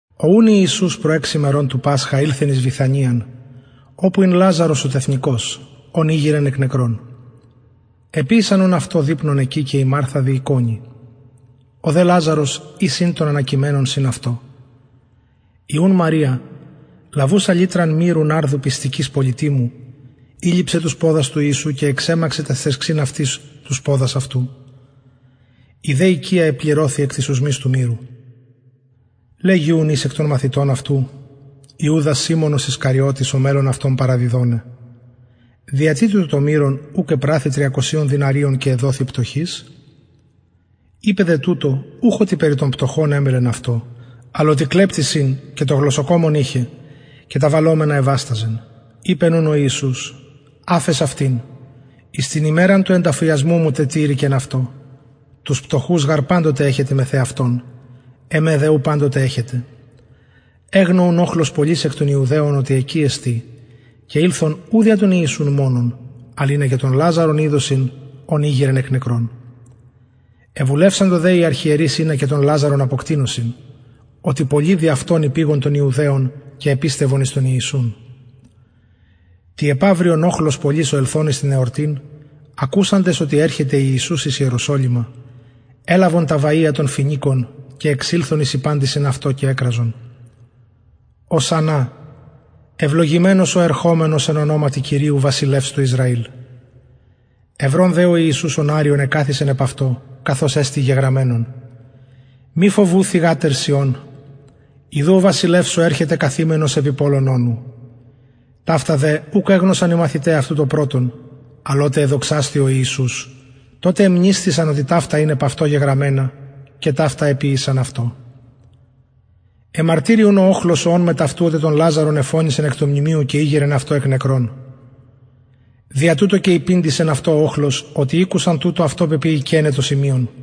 ο ουν ιησους προ εξ ημερων του πασχα ηλθεν εις βηθανιαν οπου ην λαζαρος ο τεθνηκως ον ηγειρεν εκ νεκρων εποιησαν ουν αυτω δειπνον εκει και η μαρθα διηκονει ο δε λαζαρος εις ην των ανακειμενων συν αυτω η ουν μαρια λαβουσα λιτραν μυρου ναρδου πιστικης πολυτιμου ηλειψεν τους ποδας του ιησου και εξεμαξεν ταις θριξιν αυτης τους ποδας αυτου η δε οικια επληρωθη εκ της οσμης του μυρου λεγει ουν εις εκ των μαθητων αυτου ιουδας σιμωνος ισκαριωτης ο μελλων αυτον παραδιδοναι δια τι τουτο το μυρον ουκ επραθη τριακοσιων δηναριων και εδοθη πτωχοις ειπεν δε τουτο ουχ οτι περι των πτωχων εμελεν αυτω αλλ οτι κλεπτης ην και το γλωσσοκομον ειχεν και τα βαλλομενα εβασταζεν ειπεν ουν ο ιησους αφες αυτην εις την ημεραν του ενταφιασμου μου τετηρηκεν αυτο τους πτωχους γαρ παντοτε εχετε μεθ εαυτων εμε δε ου παντοτε εχετε εγνω ουν οχλος πολυς εκ των ιουδαιων οτι εκει εστιν και ηλθον ου δια τον ιησουν μονον αλλ ινα και τον λαζαρον ιδωσιν ον ηγειρεν εκ νεκρων εβουλευσαντο δε οι αρχιερεις ινα και τον λαζαρον αποκτεινωσιν οτι πολλοι δι αυτον υπηγον των ιουδαιων και επιστευον εις τον ιησουν τη επαυριον οχλος πολυς ο ελθων εις την εορτην ακουσαντες οτι ερχεται ιησους εις ιεροσολυμα ελαβον τα βαια των φοινικων και εξηλθον εις υπαντησιν αυτω και εκραζον ωσαννα ευλογημενος ο ερχομενος εν ονοματι κυριου βασιλευς του ισραηλ ευρων δε ο ιησους οναριον εκαθισεν επ αυτο καθως εστιν γεγραμμενον μη φοβου θυγατερ σιων ιδου ο βασιλευς σου ερχεται καθημενος επι πωλον ονου ταυτα δε ουκ εγνωσαν οι μαθηται αυτου το πρωτον αλλ οτε εδοξασθη ιησους τοτε εμνησθησαν οτι ταυτα ην επ αυτω γεγραμμενα και ταυτα εποιησαν αυτω εμαρτυρει ουν ο οχλος ο ων μετ αυτου οτε τον λαζαρον εφωνησεν εκ του μνημειου και ηγειρεν αυτον εκ νεκρων δια τουτο και υπηντησεν αυτω ο οχλος οτι ηκουσεν τουτο αυτον πεποιηκεναι το σημειον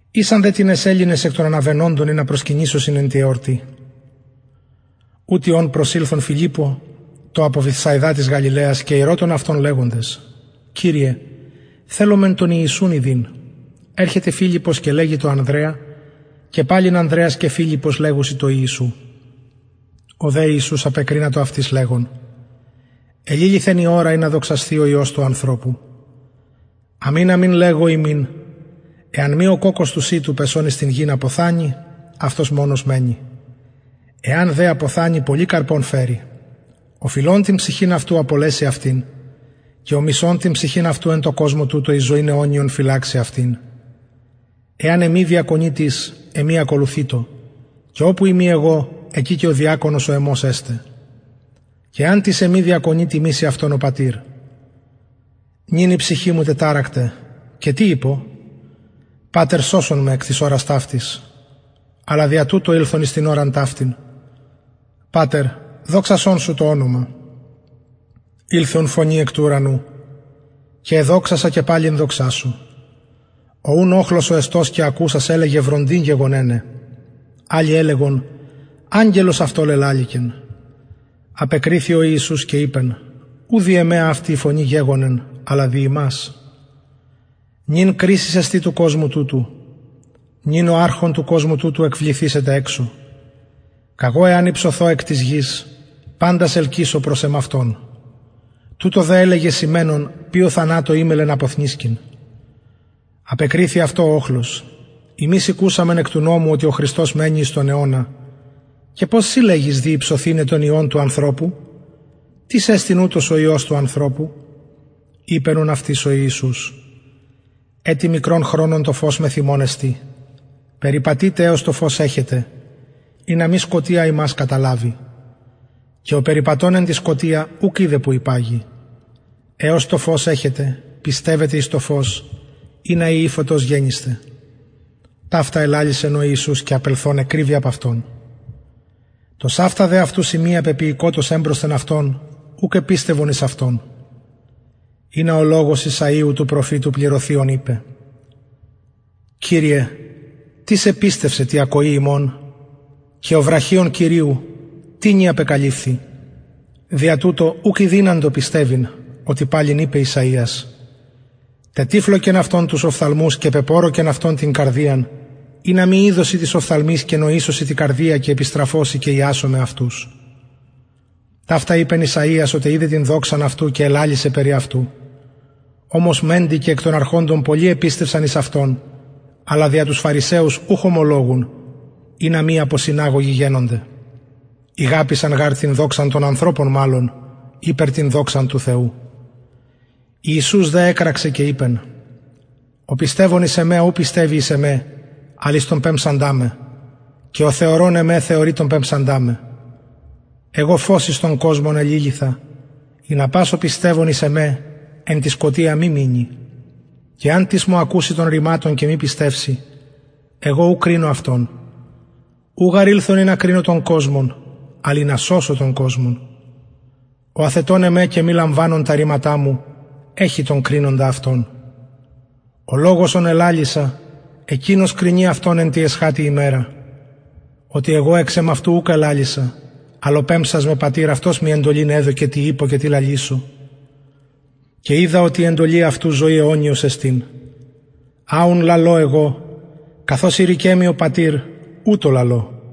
ησαν δε τινες ελληνες εκ των αναβαινοντων ινα προσκυνησωσιν εν τη εορτη ουτοι ουν προσηλθον φιλιππω τω απο βηθσαιδα της γαλιλαιας και ηρωτων αυτον λεγοντες κυριε θελομεν τον ιησουν ιδειν ερχεται φιλιππος και λεγει τω ανδρεα και παλιν ανδρεας και φιλιππος λεγουσιν τω ιησου ο δε ιησους απεκρινατο αυτοις λεγων εληλυθεν η ωρα ινα δοξασθη ο υιος του ανθρωπου αμην αμην λεγω υμιν εαν μη ο κοκκος του σιτου πεσων εις την γην αποθανη αυτος μονος μενει εαν δε αποθανη πολυν καρπον φερει ο φιλων την ψυχην αυτου απολεσει αυτην και ο μισων την ψυχην αυτου εν τω κοσμω τουτω εις ζωην αιωνιον φυλαξει αυτην εαν εμοι διακονη τις εμοι ακολουθειτω και οπου ειμι εγω εκει και ο διακονος ο εμος εσται και εαν τις εμοι διακονη τιμησει αυτον ο πατηρ νυν η ψυχη μου τεταρακται και τι ειπω πατερ σωσον με εκ της ωρας ταυτης αλλα δια τουτο ηλθον εις την ωραν ταυτην πατερ δοξασον σου το ονομα ηλθεν ουν φωνη εκ του ουρανου και εδοξασα και παλιν δοξασω ο ουν οχλος ο εστως και ακουσας ελεγεν βροντην γεγονεναι αλλοι ελεγον αγγελος αυτω λελαληκεν απεκριθη ιησους και ειπεν ου δι εμε αυτη η φωνη γεγονεν αλλα δι υμας νυν κρισις εστιν του κοσμου τουτου νυν ο αρχων του κοσμου τουτου εκβληθησεται εξω καγω εαν υψωθω εκ της γης παντας ελκυσω προς εμαυτον τουτο δε ελεγεν σημαινων ποιω θανατω εμελλεν αποθνησκειν απεκριθη αυτω ο οχλος ημεις ηκουσαμεν εκ του νομου οτι ο χριστος μενει εις τον αιωνα και πως συ λεγεις δει υψωθηναι τον υιον του ανθρωπου τις εστιν ουτος ο υιος του ανθρωπου ειπεν ουν αυτοις ο ιησους ετι μικρον χρονον το φως μεθ υμων εστιν περιπατειτε εως το φως εχετε ινα μη σκοτια υμας καταλαβη και ο περιπατων εν τη σκοτια ουκ οιδεν που υπαγει εως το φως εχετε πιστευετε εις το φως ινα υιοι φωτος γενησθε ταυτα ελαλησεν ο ιησους και απελθων εκρυβη απ αυτων τοσαυτα δε αυτου σημεια πεποιηκοτος εμπροσθεν αυτων ουκ επιστευον εις αυτον ινα ο λογος ησαιου του προφητου πληρωθη ον ειπεν κυριε τις επιστευσεν τη ακοη ημων και ο βραχιων κυριου τινι απεκαλυφθη δια τουτο ουκ ηδυναντο πιστευειν οτι παλιν ειπεν ησαιας τετυφλωκεν αυτων τους οφθαλμους και πεπωρωκεν αυτων την καρδιαν ινα μη ιδωσιν τοις οφθαλμοις και νοησωσιν τη καρδια και επιστραφωσιν και ιασωμαι αυτους ταυτα ειπεν ησαιας οτε ειδεν την δοξαν αυτου και ελαλησεν περι αυτου ομως μεντοι και εκ των αρχοντων πολλοι επιστευσαν εις αυτον αλλα δια τους φαρισαιους ουχ ωμολογουν ινα μη αποσυναγωγοι γενωνται ηγαπησαν γαρ την δοξαν των ανθρωπων μαλλον ηπερ την δοξαν του θεου ιησους δε εκραξεν και ειπεν ο πιστευων εις εμε ου πιστευει εις εμε αλλ εις τον πεμψαντα με και ο θεωρων εμε θεωρει τον πεμψαντα με εγω φως εις τον κοσμον εληλυθα ινα πας ο πιστευων εις εμε εν τη σκοτια μη μεινη και εαν τις μου ακουση των ρηματων και μη πιστευση εγω ου κρινω αυτον ου γαρ ηλθον ινα κρινω τον κοσμον αλλ ινα σωσω τον κοσμον ο αθετων εμε και μη λαμβανων τα ρηματα μου εχει τον κρινοντα αυτον ο λογος ον ελαλησα εκεινος κρινει αυτον εν τη εσχατη ημερα οτι εγω εξ εμαυτου ουκ ελαλησα αλλ ο πεμψας με πατηρ αυτος μοι εντολην εδωκεν τι ειπω και τι λαλησω και οιδα οτι η εντολη αυτου ζωη αιωνιος εστιν α ουν λαλω εγω καθως ειρηκεν μοι ο πατηρ ουτως λαλω